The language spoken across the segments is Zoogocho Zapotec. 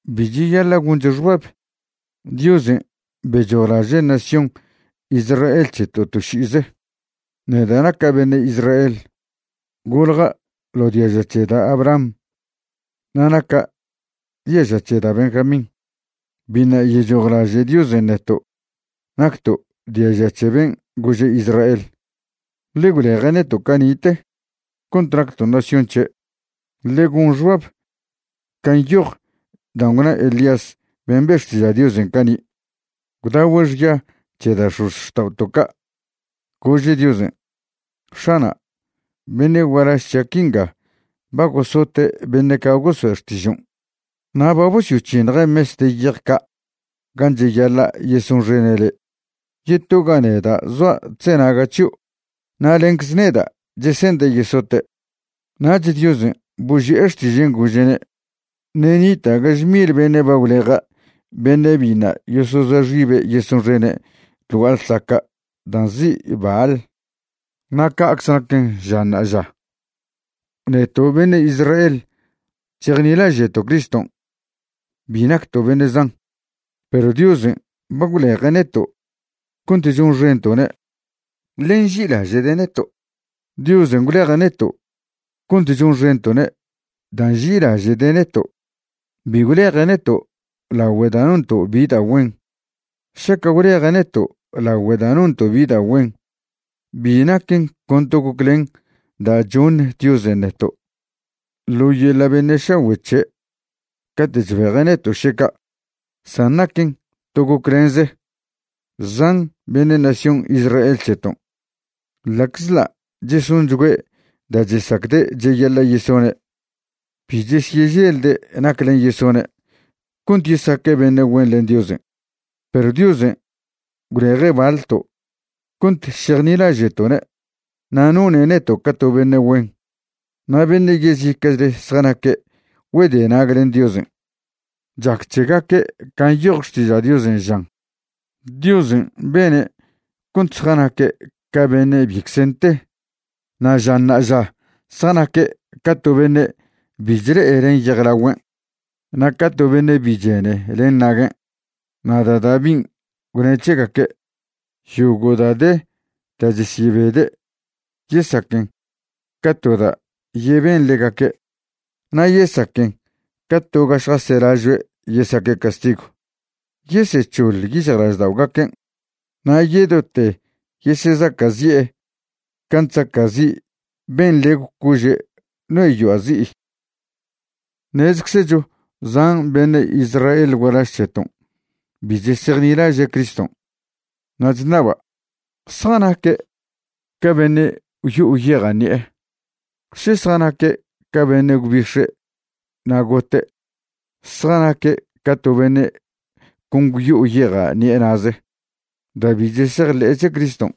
Bi cheyaḻa' goncho xbab Diosen' bechojlaže' nación Israel c̱heto' to ši'ize. Neda' naca' beṉe' Israel, golja' ḻo diaža c̱he da' Abraham na' naca' diaža' c̱he da' Benjamín. Biṉa' yechojlaže' Diosen' neto' nacto' diaža c̱he ben' gože' Israel, ḻe gwleje' neto' cani'te cont nacto' nación c̱he'. Ḻe gon xbab can' nyoj dan' gwna Elías ben' be' xtiža' Diosen' cani', gwdagüe' xya c̱he da' x̱ozxta'oto' ca', gože' Diosen': “X̱ana', beṉe' gualaž c̱hia' quinga ba gosote' beṉe' ca' goso'e xtižon', na' ba bosyoc̱hiṉje' mes de yej ca' gan' cheyaḻa' yesonxene' le'. Yetoga neda' zoa' chzenaga' c̱hio' na' lencze neda' chese'nde' yesote'.” Nach Diosen' boži'e xtižen' gože'ne': “Ṉe' nita' gaže mil beṉe' ba gwleja' beṉe' biṉa' yosozoa xibe' yesonxene' ḻ gua'a ḻsaca' dan' nzi' Baal.” Na' ca'cze naquen ža ṉa'aža, neto' beṉe' Israel chejnilaže'to' Criston' bi nacto' beṉe' zan, perw Diosen' ba gwleje' neto' cont chonxento'ne', ḻe nži'ilaže'de' neto'. Diosen' gwleje' neto' cont chonxento'ne' da' nži'ilaže'de' neto'. Bi gwleje' neto' lagüe' da' nonto' bi da' güen. Šaca' gwleje' neto' lagüe' da' nonto' bi da' güen, bi naquen con to goclen da' choṉ Diosen' neto' ḻo yeḻa' beṉe' šagüe' c̱he' cate' chbeje' neto' še ca', san naquen to goclenze. Zan beṉe' nación Israel c̱heton', ḻa'czḻa' chesonchgüe' da' chesacde' cheyaḻa' yesone', bi chesyeželde' naclen' yesone' cont yesaque' beṉe' güen len Diosen'. Perw Diosen' gwleje' baḻto' cont šejnilaže'to'ne' na' none' neto' ca to beṉe' güen. Na' beṉe' yezica'chle zjanaque' güedenag len Diosen'. Chac c̱hegaque' can' nyoj Xtiža' Diosen' žan: “Diosen' bene' cont zjanaque' ca beṉe' bicze nte. Na' ža ṉa'aža zjanaque' ca to beṉe' bi chle'e len yejlagüen', na' ca to beṉe' bi chene len naguen'.” Na' da' Davin' gwne' c̱hegaque': Yogo' da' de da' chesyebede' yesaquen ca to da' yeben ḻegaque', na' yesaquen ca to ga šjaselažoe' yesaque' castigw. Yesec̱hoḻ yic̱hjlažda'ogaquen', na' yedote yesezaca'zi'e can' chzaca'zi' ben' nḻegw cože' no'e yoa' zi'i. Ṉezeczecho zan beṉe' Israel gualaž c̱heton' bi chesejnilaže' Criston'. Na' chṉaba', ¿zjanaque' ca beṉe' gwyo'o yeja' ṉi'e? ¿še zjanaque' ca beṉe' gwbix̱e' na' gote'? Zjanaque' ca to beṉe' con gwyo'o yeja' ṉi'e na'ze. Da' bi chesejḻe'e c̱he Criston'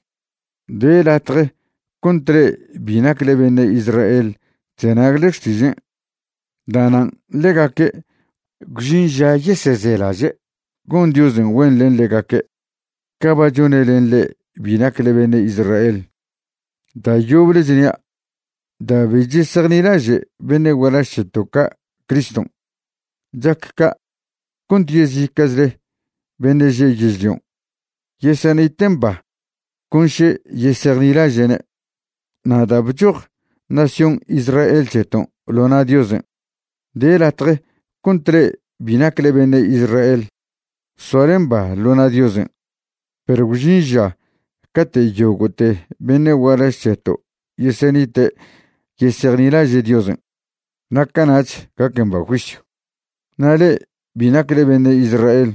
de latje cont le'e bi nacle beṉe' Israel chzenagle xtižen'. Da'nan' ḻegaque' gwžin ža yesezelaže' gon Diosen' güen len ḻegaque' ca ba chone' len le'e bi nacle beṉe' Israel. Da' yoble chnia', da' bi chesejnilaže' beṉe' gualaž c̱heto' ca' Criston', chac ca' cont yezica'chle beṉe' že' yežlion' yesenite' mba con še yesejnilaže'ne'. Na' da' bchoj nación Israel c̱heton' ḻo na' Diosen', de latje cont le'e bi nacle beṉe' Israel soale mba ḻo na' Diosen'. Perw gwžin ža cate' yogo'te beṉe' gualaž c̱heto' yesenite' yesejnilaže' Diosen', na' cana'ch gac mba juisyw. Na' le'e bi nacle beṉe' Israel,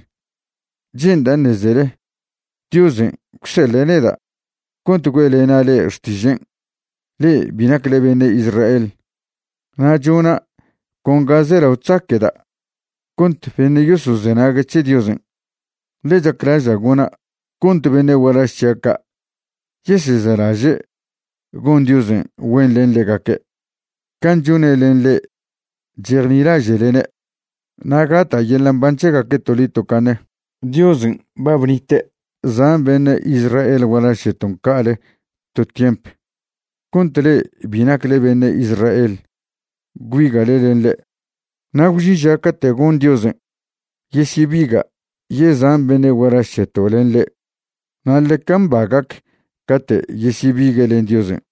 che'nda' ṉezele Diosen' gwseḻe' neda' cont güe'lena' le'e xtižen' le'e bi nacle beṉe' Israel. Na' chona' con ga zelao chzaque'da' cont beṉe' yosozenague' c̱he Diosen'. Ḻe chaclaža' gona' cont beṉe' gualaž c̱hia' ca' yesezelaže' gon Diosen' güen len ḻegaque' can' chone' len le'e chejnilaže'lene', na' gata' yeḻa' mban c̱hegaque' toḻi tocaṉe. Diosen' ba bnite' zan beṉe' Israel gualaž c̱heton' ca'ale to tiemp cont le'e bi nacle beṉe' Israel gwbiga'le len ḻe'. Na' gwžin ža cate' gon Diosen' yesyebiga' yezan beṉe' gualaž c̱heto' len ḻe'. Na' ḻeca mba gac cate' yesyebigue' len Diosen'.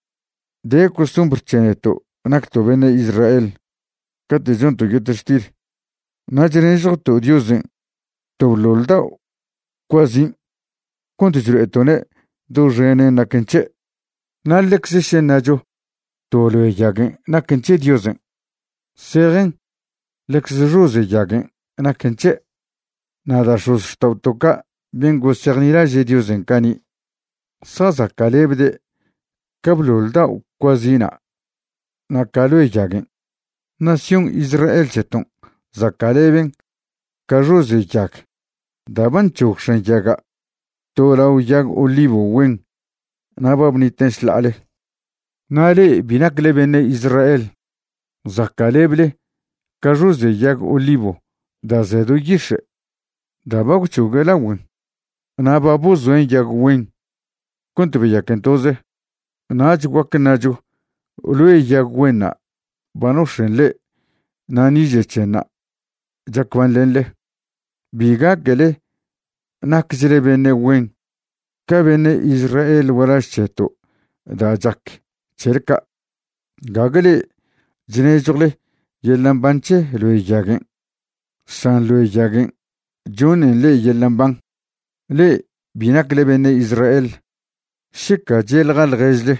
De costumbr c̱he neto' nacto' beṉe' Israel cate' chonto' yetextil, na' chnežjwto' Diosen' to bḻoḻ dao' cuazin' cont chlo'eto'ne' doxenen naquen c̱he'. Na' ḻecze še ṉacho to loe yaguen' naquen c̱he Diosen', zejen ḻecze xoze' yaguen' naquen c̱he'. Na' da' x̱ozxta'oto' ca' ben' gosejnilaže' Diosen' cani' zjazaca'lebde' ca bḻoḻ dao' cuazina' na' ca' loe yaguen'. Nación Israel c̱heton' zaca'leben ca xoze' yag da' ba nc̱hog x̱an yaga' to lao yag olivo güen na' ba bniten' šḻa'ale. Na' le'e bi nacle beṉe' Israel zaca'leble ca xoze' yag olivo da' ze do yix̱e', da' ba gwc̱hogue' lagüen na' ba bozoen' yag güen cont beyaquen toze. Nach guac ṉacho loe yag güenṉa' ba nox̱en' le'e na' niže' c̱henṉa' chac banḻenḻe. Bi gaquele naquechle beṉe' güen ca beṉe' Israel gualaž c̱heto' da' chac c̱hele ca'. Gague le'e chnežjwle yeḻa' mban c̱he loe yaguen', san loe yaguen' choṉen le'e yeḻa' mban. Le'e bi nacle beṉe' Israel, šeca che'ḻja ḻježle: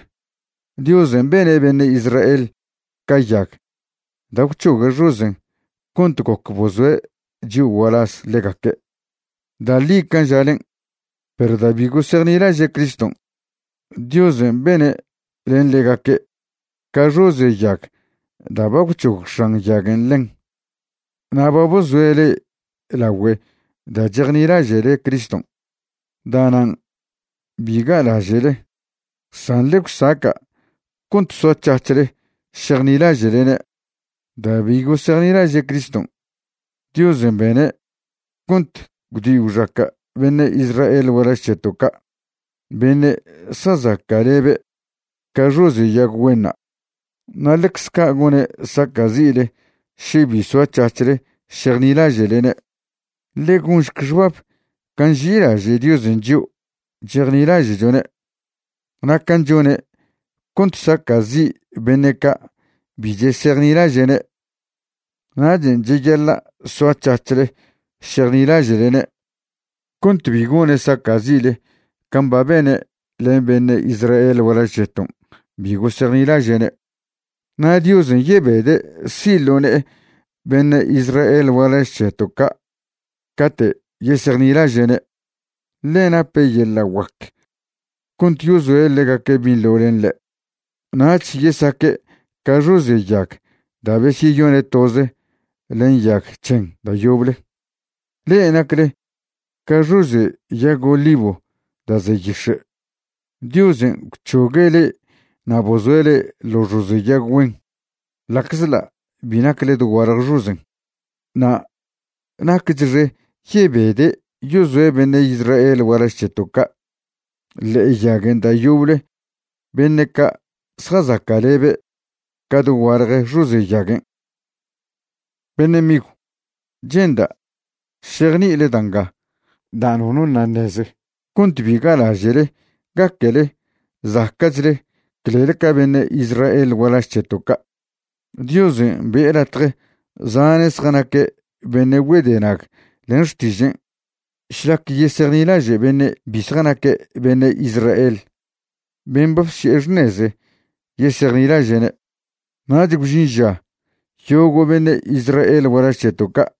“Diosen' bene' beṉe' Israel ca yag da' gwc̱hogue' xozen' cont goc bozoe' chio' gualaz ḻegaque'.” Da' ḻi can' žalen'. Perw da' bi gosejnilaže' Criston', Diosen' bene' len ḻegaque' ca xoze' yag da' ba gwc̱hog x̱an yaguen' ḻen, na' ba bozoe' le'e lagüe da' chejnilaže'le Criston'. Da'nan' bi ga'laže'le, san ḻe gwsaca' cont soac̱hac̱hle šejnilaže'lene'. Da' bi gosejnilaže' Criston', Diosen' bene' cont gwdi gwxaca' beṉe' Israel gualaž c̱heto' ca' beṉe' zjazaca'lebe' ca xoze' yag güenṉa', na' ḻecze ca' gone' saca'zi'le še bi soac̱hac̱hle šejnilaže'lene'. Ḻe gonšc xbab can' nži'ilaže' Diosen' chio' chejnilaže'chone' na' can' chone' cont saca'zi' beṉe' ca' bi chesejnilaže'ne'. Nachen' cheyaḻa' soac̱hac̱hle šejnilaže'lene' cont bi gone' saca'zi'le can' ba bene' len beṉe' Israel gualaž c̱heton' bi gosejnilaže'ne'. Na' Diosen' yebede' si' ḻo ne'e beṉe' Israel gualaž c̱heto' ca' cate' yesejnilaže'ne', ḻe nape' yeḻa' guac cont yozoe' ḻegaque' binḻo len ḻe', nach yesaque' ca xoze' yag da' bezyone' toze len yag c̱hen da' yoble. Le'e nacle ca xoze' yag olivo da' ze yix̱e', Diosen' gwc̱hogue' le'e na' bozoe' le'e ḻo xoze' yag güen ḻa'czḻa' bi nacle dogualje xozen'. Na' naquechxe yebede' yozoe' beṉe' Israel gualaž c̱heto' ca' ḻe'e yaguen' da' yoble beṉe' ca' zjazaca'lebe' ca dogualje xoze' yaguen'. Beṉe' migw, che'nda' šejni'ile da' nga da' nono ṉa' ṉeze cont bi ga'laže'le gaquele zaca'chle clel ca beṉe' Israel gualaž c̱heto' ca'. Diosen' be'e latje zane' zjanaque' beṉe' güedenag len xtižen' šlac yesejnilaže' beṉe' bi zjanaque' beṉe' Israel ben' ba bsi'e xṉeze yesejnilaže'ne'. Nach gwžin ža yogo' beṉe' Israel gualaž c̱heto' ca'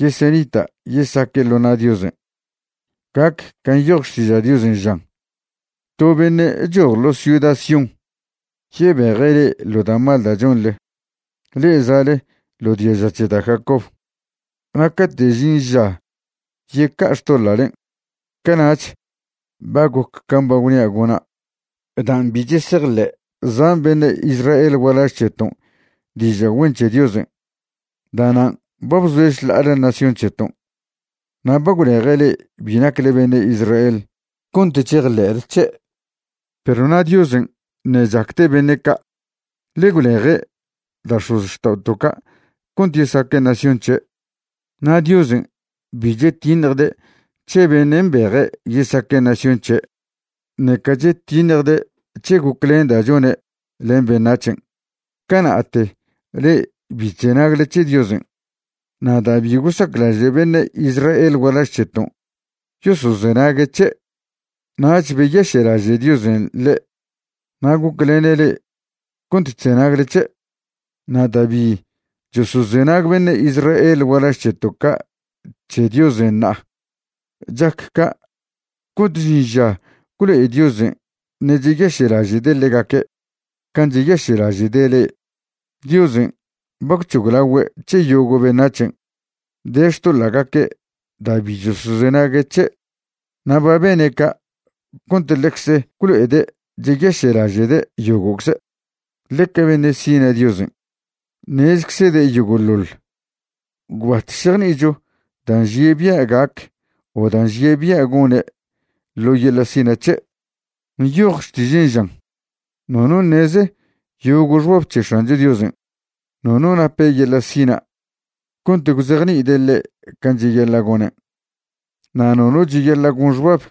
yesenita' yesaque' ḻo na' Diosen'. Gac can' nyoj Xtiža' Diosen' žan: To beṉe' choj ḻo ciuda Sión yebeje' le'e ḻo da' mal da' chonḻe, le'e za'le ḻo diaža c̱he da' Jacob. Na' cate' žin ža yeca'a xtoḻa'len', cana'ch ba goc can' ba gwnia' gona'. Dan' bi chesejḻe' zan beṉe' Israel gualaž c̱heton' diža' güen c̱he Diosen', da'nan' ba bzoe' šḻa'ale nación c̱heton' na' ba gwleje' le'e bi nacle beṉe' Israel cont chejḻe'le c̱he'. Perw na' Diosen' ṉe' chacde' beṉe' ca', ḻe gwleje' da' x̱ozxta'oto' ca' cont yesaque' nación c̱he'. Na' Diosen' bi chetiṉjde' c̱he beṉe' mbeje' yesaque' nación c̱he', ṉeca chetiṉjde' c̱he goclen da' chone' len beṉac̱hen'. Cana'te le'e bi bzenagle c̱he Diosen' na' da' bi gosaclaže' beṉe' Israel gualaž c̱heton' yosozenague' c̱he', nach beyaše'laže' Diosen' le'e na' goclene' le'e cont chzenagle c̱he'. Na' da' bi chosozenag beṉe' Israel gualaž c̱heto' ca' c̱he Diosen' ṉa'a, chac ca' cont žin ža gwlo'e Diosen' ṉe' cheyaše'laže'de' ḻegaque' can' cheyaše'laže'de' le'e. Diosen' ba gwc̱hoglagüe' c̱he yogo' beṉac̱hen' de xtoḻa'gaque' da' bi chosozenague' c̱he', na' ba bene' ca' cont ḻecze gwlo'ede' cheyaše'laže'de' yogo'cze'. Ḻeca beṉe' sina' Diosen'. Ṉezczede' yogo'ḻoḻ. Gwbat šejni'icho da' nžie' bia' gac o da' nžie' bia' gone' ḻo yeḻa' sina' c̱he'. Nyoj Xtižen' žan: “Nono ṉeze yogo' xbab c̱he X̱ancho Diosen'; nono nape yeḻa' sina' cont gwzejni'ide' ḻe' can' cheyaḻa' gonen'. Na' nono cheyaḻa' gon xbab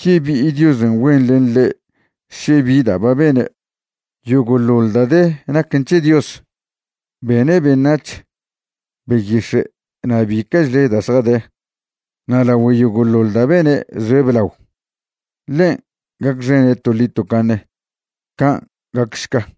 yebi'i Diosen' güen len ḻe' še bi da' ba be'ene'.” Yogo'ḻoḻ da' de naquen c̱he Dios. Bene' beṉac̱h, beyix̱e' na' bica'chle da' zjade. Na' lagüe yogo'ḻoḻ da' bene' zoe' blao. Ḻen' gacxene' toḻi tocaṉe. Can' gacšca.